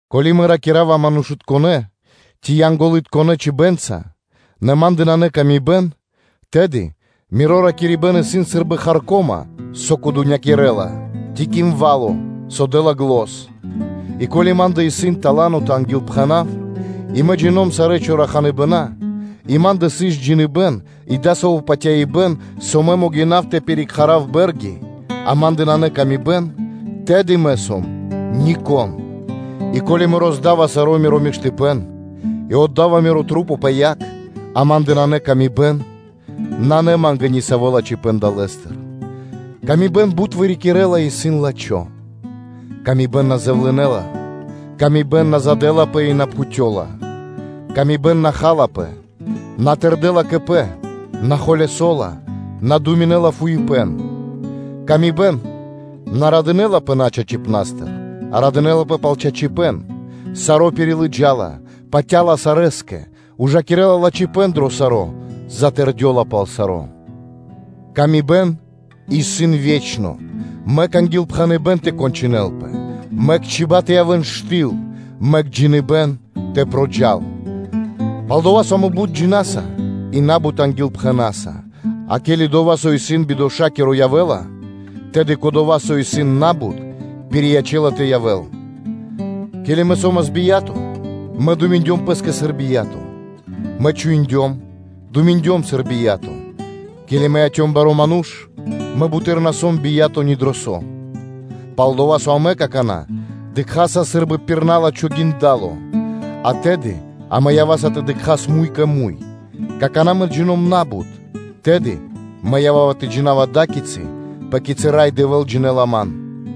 Ко́ли мэ ракира́ва манушытконэ́, ци Янголытконэ чибэнца (чибьенца), нэ ма́ндэ нанэ пшалы́тко паты́в кэ яви́р мануша́, тэды миро ракирибэ́н исын сы́рбы харко́ма (медь), со кудунякирэла (звенинэла), ци кимвало, со дэ́ла зан. И ко́ли ма́ндэ исын тала́но тэ ангилпхэнав, и мэ джино́м сарэ́ чораханыбэна и ма́ндэ сыс джиныбэ́н и дасаво патяибэ́н, со мэ могинав тэ пирикхара́в (пиричхува́в) бэ́рги, а ма́ндэ нанэ пшалы́тко паты́в, тэды мэ сом нико́н. И ко́ли мэ роздава саро́ миро миштыпэ́н и отда́ва мирэ́ маса́ пэ яг, а ма́ндэ нанэ пшалы́тко паты́в – нанэ ма́нгэ ни саво́ лачхипэ́н далэ́стыр. Пшалы́тко паты́в бут вырикирэ́ла и исын лачхо́; пшалы́тко паты́в на дэ́ла якхало; пшалы́тко паты́в на задэлапэ и на пхутёла; Пшалы́тко паты́в на халапэ, на родэ́ла льго́та пэ́скэ, на холясо́ла, на думинэ́ла фуипэ́н; пшалы́тко паты́в на радынэ́лапэ начачипастыр, а радынэ́лапэ пал чачипэ́н; саро́ пирилыджала, патя́ла сарэскэ, ужакирэ́ла лачхипэ́н дро саро́, затэрдёла пал саро́. Пшалы́тко паты́в исын ве́чно, мэк ангилпхэныбэ́н тэ кончынэлпэ, мэк чиба́ (чибья́) тэ явэ́н штыл (циха), мэк джиныбэ́н тэ проджал. Пал-дова́ со амэ на́бут джина́са и на́бут ангилпхэнаса: а ке́ли дова́, со исын бидошакиро явэ́ла, тэды кодова́, со исын на́бут, пириячэ́ла тэ явэ́л. Ке́ли мэ со́мас бия́то, мэ ракирдём сыр бия́то, мэ думиндём пэ́скэ сыр бия́то, мэ ґалёвавас сыр бия́то; ке́ли мэ яцём барэ́ манушэ́са, мэ буты́р на сом бия́то ни дро со. Пал-дова́ со амэ какана́ дыкхаса сы́рбы пир на́лачхо гиндало, а тэды амэ ява́са тэ дыкхас муй кэ муй; какана́ мэ джино́м на́бут, тэды мэ ява́ва тэ джина́в ада́кицы, пэ кицы́ Рай Дэвэ́л джинэ́ла ман.